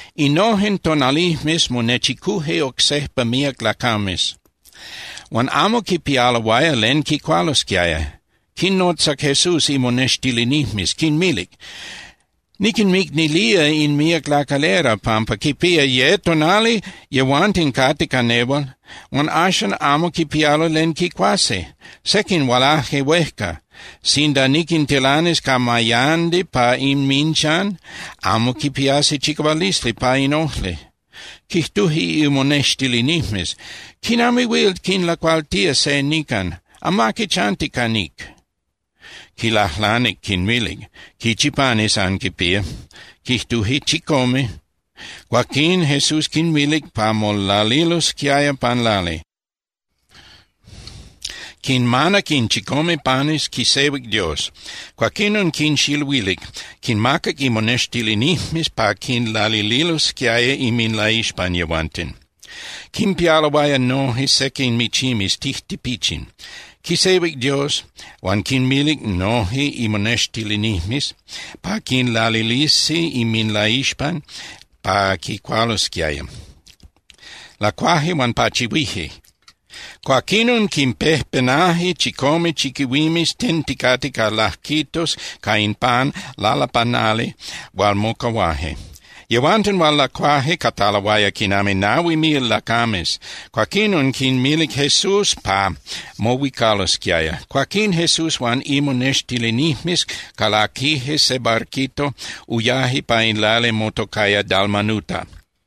Innojen tonalijmes monechicuje oc sejpa míac lacames, huan amo quipialoaya len quicualosquiaya. Quinnotzac Jesús imonextilinijmes quinmilic: —Niquinmicnilía in míac lacalera pampa quipía ye tonali yehuanten cate ca nehual huan axan amo quipialo len quicuasi. Sequin hualaje huejca. Sinda niquintilanis ca mayandi pa inminchan, amo quipiasi chicahualisli pa in ojli. Quijtuje imonextilinijmes: —¿Quinami huil quinlacualtía se nican? Amaqui chanti ca níc. Quilajlanic, quinmilic: —¿Quichi panes anquinpía? Quijtuje: —Chicome. Cuaquín Jesús quinmilic pa molalilosquiaya pan lali. Quinmanac in chicome panes, quisehuic Dios. Cuaquinon quinxiluilic, quinmacac imonextilinijmes pa quinlalililosquiaya inminlaixpan yehuanten. Quimpialoaya noje sequin michimes tijtipichin. Quisehuic Dios, huan quinmilic noje imonextilinijmes pa quinlalilisi inminlaixpan pa quicualosquiaya. Lacuaje huan pachihuije. Cuaquinon quinpejpenaje chicome chiquihuimes tenticate ca lajquitos ca in pan lalapanali hual mocahuaje. Yehuanten hual lacuaje cataloaya quinami nahui mil lacames. Cuaquinon quinmilic Jesús pa mohuicalosquiaya. Cuaquín, Jesús huan imonextilinijmes calaquije se barquito, uyaje pa in lali motocaya Dalmanuta.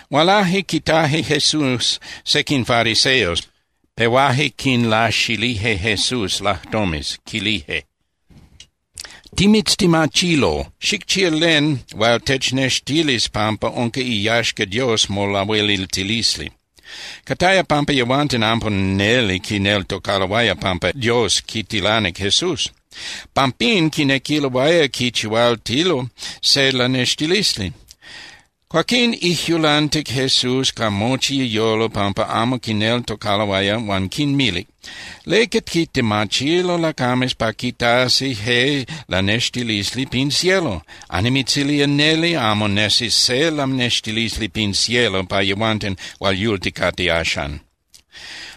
Hualaje quitaje Jesús sequin fariseos, pehuaje quinlaxilije Jesús lajtomes, quilije: —Timitztemachilo, xicchía len hual technextilis pampa unca iyaxca Dios molahueliltilisli. Cataya pampa yehuanten amo neli quineltocaloaya pampa Dios quitilanic Jesús. Pampín quinequiloaya quichihualtilo se lanextilisli. Cuaquín ijyulantic Jesús ca mochi iyolo pampa amo quineltocaloaya huan quinmilic: —¿Leca quitemachilo lacames pa quitasi je lanextilisli pin cielo? Annimitzilía neli, amo nesis se lanextilisli pin cielo pa yehuanten hual yulticate axan.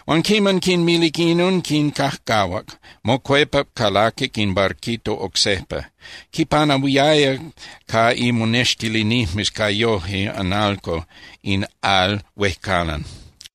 Huan quiman quinmilic inon, quincajcahuac, mocuepac calaquic in barquito oc sejpa. Quipanahuiaya ca imonextilinijmes ca yoje (analco) in al huejcalan.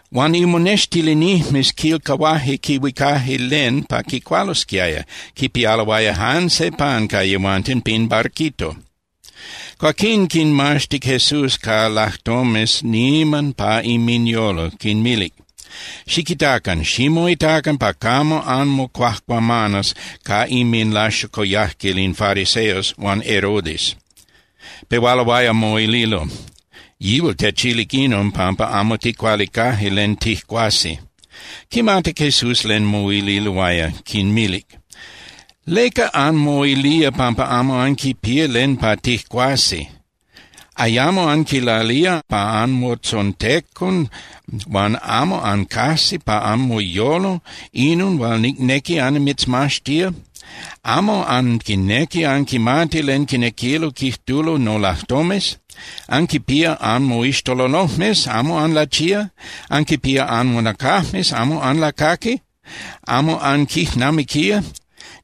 Huan imonextilinijmes quilcahuaje quihuicaje len pa quicualosquiaya, quipialoaya jan se pan ca yehuanten pin barquito. Cuaquín quinmaxtic Jesús ca lajtomes niman pa inminyolo, quinmilic: —Xiquitacan. Ximoitacan pa camo anmocuajcuamanas ca inminlaxocoyajquil in fariseos huan Herodes. Pehualoaya moililo: —Yihual techilic inon pampa amo ticualicaje len tijcuasi. Quimatic Jesús len moililoaya, quinmilic: —¿Leca anmoilía pampa amo anquipía len pa tijcuasi? ¿Ayamo anquilalía pa anmotzontecon huan amo ancajsi pa anmoyolo inon hual nicnequi annimitzmaxtía? ¿Amo anquinequi anquimati len quinequilo quijtulo nolajtomes? Anquinpía anmoixtololojmes. ¿Amo anlachía? Anquinpía anmonacajmes. ¿Amo anlacaqui? ¿Amo anquijnamiquía?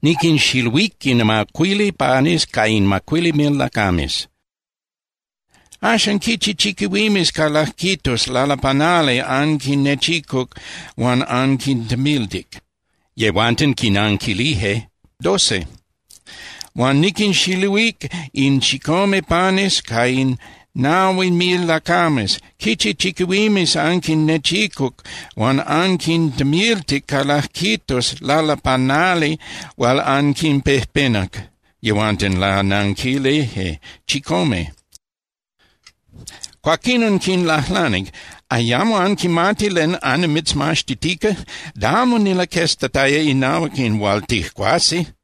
Niquinxiluíc in macuili panes ca in macuili mil lacames. Axan, ¿quichi chiquihuimes ca lajquitos lalapanali anquinnechicuc huan anquintemiltic? Yehuanten quinanquilije: —Doce. —Huan niquinxiluíc in chicome panes ca in nahui mil lacames. ¿Quichi chiquihuimes anquinnechicuc huan anquintemiltic ca lajquitos lalapanali hual anquinpejpenac? Yehuanten lananquilije: —Chicome. Cuaquinon quinlajlanic: —¿Ayamo anquimati len annimitzmaxtitica? Da amo nilaqueztataya inahuac in hual tijcuasi.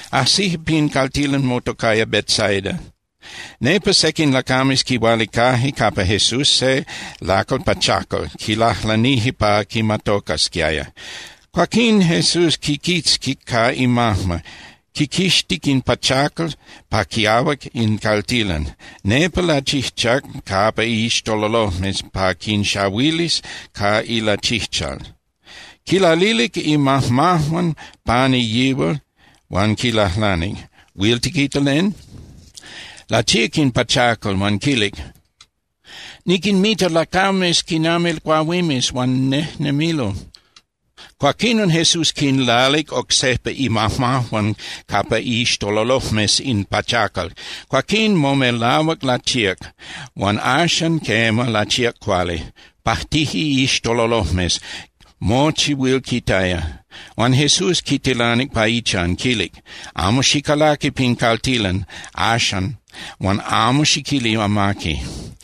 Ajsije pin caltilan motocaya Betsaida. Nepa sequin lacames quihualicaje capa Jesús se lacal pachacal, quilajlanije pa quimatocasquiaya. Cuaquín Jesús quiquitzquic ca imajma, quiquixtic in pachacal pa quiahuac in caltilan. Nepa lachijchac capa iixtololojmes pa quinxahuilis ca ilachijchal, quilalilic imajmajuan pani yihual huan quilajlanic: —¿Huil tiquita len? Lachíac in pachacal huan quilic: —Niquinmita lacames quinami cuahuimes, huan nejnemilo. Cuaquinon Jesús quinlalic oc sejpa imajmajuan capa iixtololojmes in pachacal. Cuaquín momelahuac lachíac, huan axan, quema, lachíac cuali. Pajtije iixtololojmes, mochi huil quitaya. Huan Jesús quitilanic pa ichan, quilic: —Amo xicalaqui pin caltilan axan huan amo xiquili amaqui.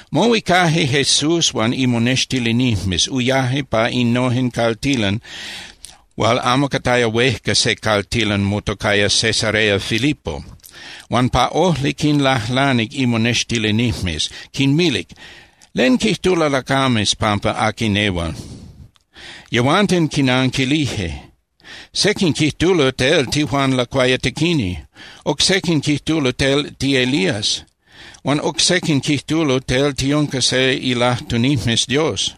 Mohuicaje Jesús huan imonextilinijmes, uyaje pa innojen caltilan hual amo cataya huejca se caltilan motocaya Cesarea Filipo. Huan pa ojli quinlajlanic imonextilinijmes, quinmilic: —¿Len quijtulo lacames pampa aqui nehual? Yehuanten quinanquilije: —Sequin quijtulo tel tiJuan Lacuayatequini. Oc sequin quijtulo tel tiElías. Huan oc sequin quijtulo tel tiunca se ilajtunijmes Dios.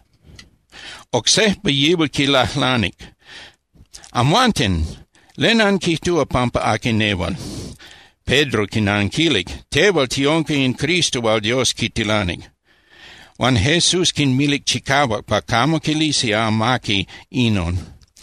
Oc sejpa yihual quinlajlanic: —Amhuanten, ¿len anquijtúa pampa aqui nehual? Pedro quinanquilic: —Tehual tiunca in Cristo hual Dios quitilanic. Huan Jesús quinmilic chicahuac pa camo quilisi amaqui inon.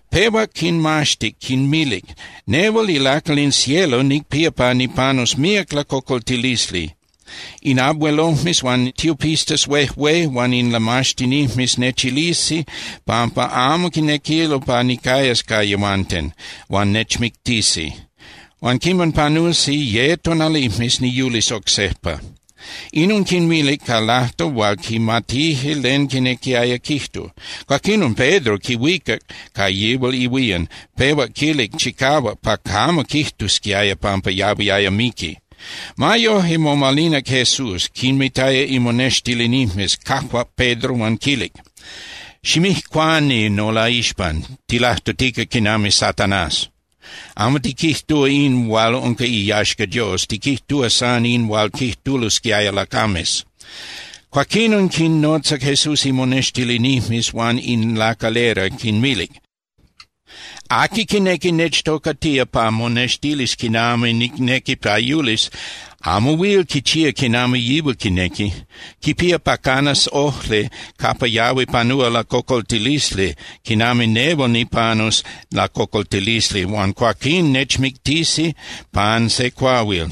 Pehuac quinmaxtic, quinmilic: —Nehual ilacal in cielo nicpía pa nipanus míac lacocoltilisli. In abuelojmes huan tiopistas huejué huan in lamaxtinijmes nechilisi pampa amo quinequilo pa nicayas ca yehuanten, huan nechmictisi. Huan quiman panusi ye tonalijmes, niyulis oc sejpa. Inon quinmilic ca lajtol hual quimatije len quinequiaya quijtu. Cuaquinon Pedro quihuicac ca yihual ihuían, pehuac quilic chicahuac pa camo quijtusquiaya pampa yahuiaya miqui. Ma yoje, momalinac Jesús, quinmitaya imonextilinijmes, cajuac Pedro huan quilic: —¡Ximijcuani nolaixpan! Tilajtutica quinami Satanás. Amo tiquijtúa in hual unca iyaxca Dios, tiquijtúa san in hual quijtulosquiaya lacames. Cuaquinon quinnotzac Jesús imonextilinijmes huan in lacalera, quinmilic: —Aqui quinequi nechtocatía pa monextilis quinami nicnequi pa yulis, amo huil quichía quinami yihual quinequi. Quipía pa canas ojli capa yahui panúa lacocoltilisli quinami nehual nipanus lacocoltilisli huan cuaquín nechmictisi pan se cuahuil.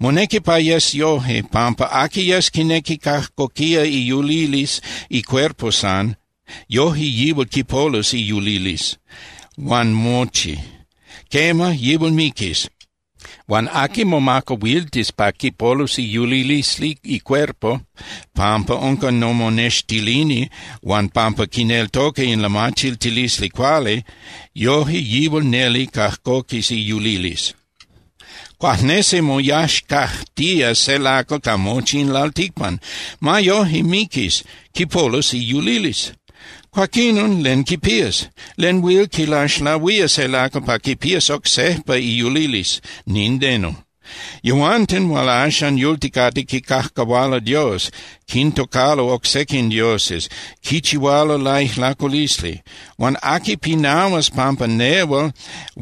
Monequi pa yes yoje, pampa aqui yes quinequi cajcoquía iyulilisli icuerpo san, yoje yihual quipolus iyulilisli huan mochi. Quema, yihual miquis. Huan aqui momacahuiltis pa quipolus iyulilisli icuerpo pampa unca nomonextilini huan pampa quineltoca in lamachiltilisli cuali, yoje yihual neli cajcoquis iyulilisli. Cuajnesi moyaxcajtía se lacal ca mochi in lalticpan. Ma yoje, miquis, quipolus iyulilisli. Cuaquinon, ¿len quipías? ¿Len huil quilaxlahuía se lacal pa quipías oc sejpa iyulilisli? Nindeno. Yehuanten hual axan yulticate quicajcahualo Dios, quintocalo oc sequin dioses, quichihualo laijlaculisli. Huan aqui pinahuas pampa nehual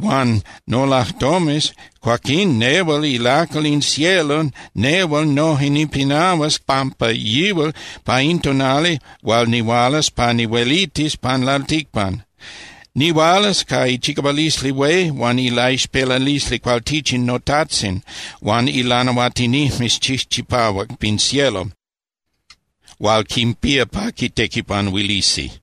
huan nolajtomes, cuaquín nehual ilacal in cielo, nehual noje nipinahuas pampa yihual pa in tonali hual nihualas pa nihuelitis pan lalticpan. Nihualas ca ichicahualisli hué huan ilaixpelalisli cualtichin noTajtzin huan ilanahuatinijmes chijchipahuac pin cielo hual quinpía pa quitequipanuilisi.